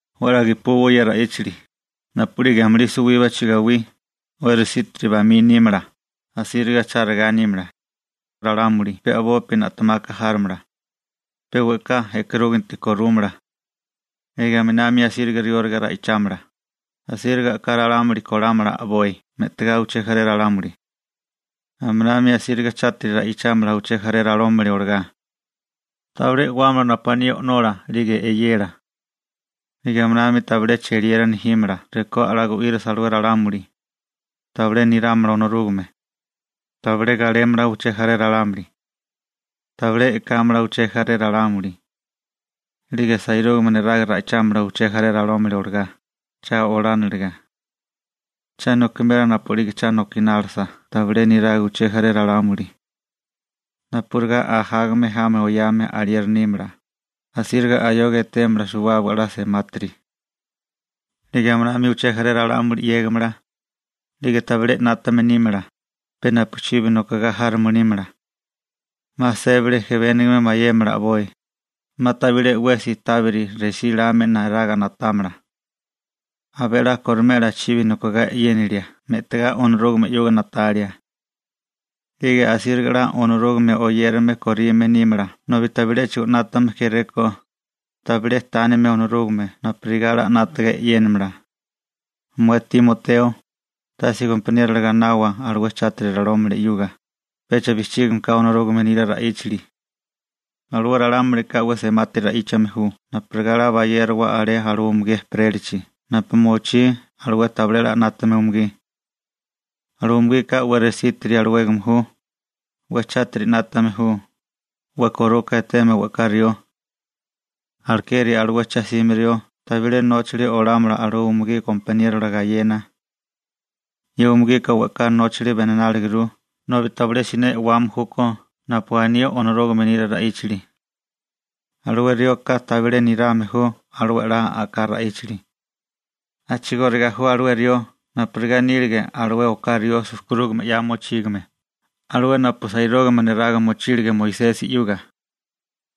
'We 'la gepuwa ye ra'íchali: Napu'lige amulí suwíbachi gawí, 'we resítiri bamí nímala, asíriga chárigá nímala. Ralámuli pe a'bopi na'temaka járomala. Pe we'ká e'karúginti korúmala. 'Lige aminami asíriga rióliga ra'ichámala, asíriga a'ká ralámuli kolámala a'boi me'tigá uché jaré ralámuli. Aminami asíriga chátiri ra'ichámala uché jaré ralámuli olagá. Tabilé e'wámala napu aní o'nola 'lige eyela. 'Lige aminami tabilé cheliera nejímala rekó 'la gu'írasa alué ralámuli. Tabilé nirámala Onorúgame. Tabilé galémala uché jaré ralámuli. Tabilé e'kámala uché jaré ralámuli. 'Lige sairúgame neraga ra'ichámala uché jaré ralámuli olagá, cha olániliga. Cha nokimela napu'lige cha nokinálisa tabilé niraga uché jaré ralámuli. Napurigá ajágame jami oyame alieri nímala, asíriga ayoga etémala suwábaga 'la semátiri. 'Lige aminami uché jaré ralámuli 'yégimala. 'Lige tabilé 'nátame nímala, pe napuchibi nokogá járome nímala. 'Ma sébali ejebénigame mayémala a'boi, 'ma tabilé 'wesi tábiri resíláame neraga na'támala. Abé 'la korimela chibi nokogá e'yénilia me'tigá Onorúgame 'yuga na'talia. 'Lige asíriga 'la Onorúgame oyérame korime nímala nobi tabiléchigo 'nátame kéréko, tabilé tánime Onorúgame napurigá 'la 'nátaga e'yénamala. Mué Timoteo, tase gompaniero gainawa alué chátiri ralámuli 'yuga, pecha bijchígame ka Onorúgame nila ra'íchali. Alué ralámulika 'we semátiri ra'íchame ju napurigá 'la bayérowa alé alué umugí ejperélachi napu mochí alué tabilé 'la 'nátame umugí. Alué umugika 'we resítiri alawégame ju, 'we chátiri 'nátame ju, 'we koruka eteme we'ká rió. Alekeri alué cha'sime rió tabilé nóchali olámala alué umugí gompaniérola gayena. Ye umugika we'ká nóchali benináliguru nobi tabilé siné e'wame júkó napu aní Onorúgame nila ra'íchali. Alué rioka tabilé nirame ju alué 'la a'ká ra'íchali. A'chigóriga ju alué rió napurigá nílige alué oká rió sujkurúgame 'ya mochígame, alué napu sairúgame neraga mochílige Moisesi 'yuga.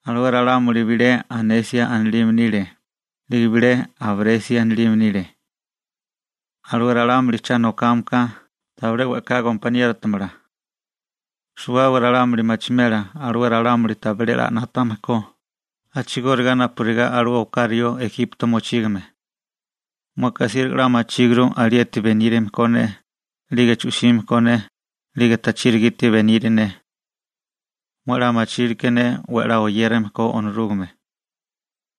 Alué ralámuli bilé Janesi anilime nile, 'lige bilé Jabresi anilime nile. Alué ralámuli cha nokame ka tabilé we'ká gompaniérotamala. Suwábaga ralámuli machimela alué ralámuli tabilé 'la 'nátame ko, a'chigóriga napurigá alué oká rió Ejipto mochígame. Mueka asíriga 'la machíguru alieti benírame ko ne, 'lige chu'sime ko ne, 'lige tachiri gite beniri ne. Mué 'la machilke ne 'we 'la oyérame ko Onorúgame.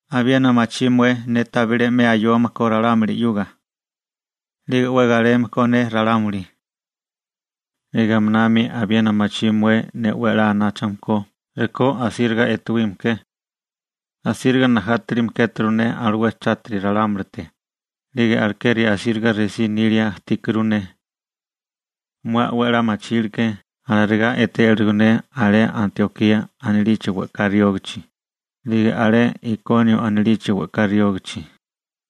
Abiena machí mué ne tabilé 'me ayome ko ralámuli 'yuga. 'Lige 'we galeme ko ne ralámuli. 'Lige aminami abiena machí mué ne 'we anáchame ko rekó rasíriga etuíme ke. Asíriga najátilime kéturu ne alué chátiri ralámulite, 'lige alekeri asíriga resí nilia ajtíkuru ne. Mué 'we 'la machilke alarigá etélirigo ne alé Antiokía anilichi we'ká riógichi, 'lige alé Ikonio anilichi we'ká riógichi,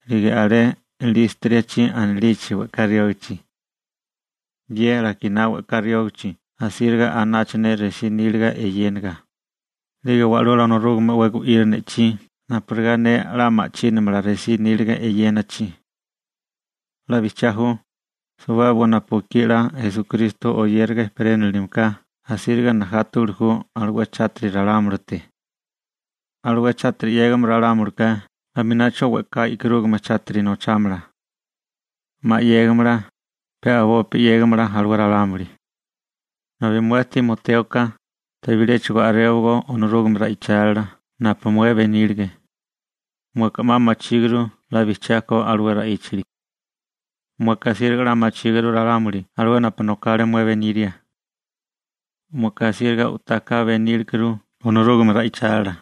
'lige alé Lístrasi anilichi we'ká riógichi. Ye lakiná we'ká riógichi asíriga anacha ne resí níliga eyéniga, 'lige wa'lula Onorúgame 'we gu'iri ne'chí napurigá ne 'la ma'chínamala resí níliga eyénachi. 'La bijchiá ju, suwábaga napu ekí 'la Esukristo oyériga ejperénilime ka asíriga najátawili ju alué chátiri ralámulite. Alué chátiri 'yégame ralámulika aminacho we'ká e'karúgame chátiri nochámala. 'Ma 'yégamala, pe a'bopi 'yegámala alué ralámuli. Nobi mué Timotéoka, tabiléchigo a'réwagó Onorúgame ra'ichálila napu mué benílige. Mueka 'ma machíguru 'la bijchiá ko alué ra'íchali. Mueka asíriga 'la machíguru ralámuli alué napu nokale mué beníria. Mueka asíriga u'tá ka benílekuru Onorúgame ra'ichálila.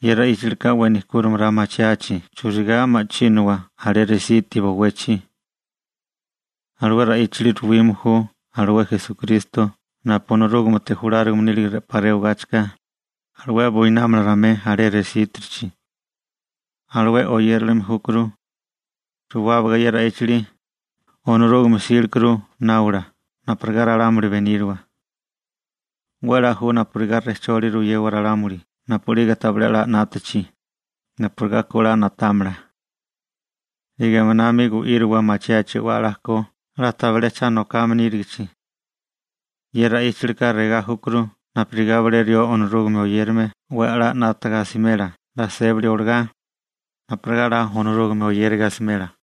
Ye ra'íchalika 'we nejkúrimala machiachi churigá ma'chínawa alé resiti bowechi. Alué ra'íchali ruwime ju alué Esukristo napu Onorúgamete julárigame nílige 'pa rewagáchika, alué buinámala ramué alé resítirichi. Alué oyérilime júkuru. Suwábaga ye ra'íchali, Onorúgame 'sílekuru náwala napurigá ralámuli beníriwa. 'We 'la ju napurigá rejcholi ruyewa ralámuli napu'lige tabilé a'lá 'nátachi, napurigá ku 'la na'támala. 'Lige aminami gu'íriwa machiachi 'we 'la ko 'la tabilé cha nokame nírigichi. Ye ra'íchalika regá júkuru napurigá bilé rió Onorúgame oyérame 'we 'la 'nátaga asimela 'la sébali olagá, napurigá 'la Onorúgame oyériga asimela.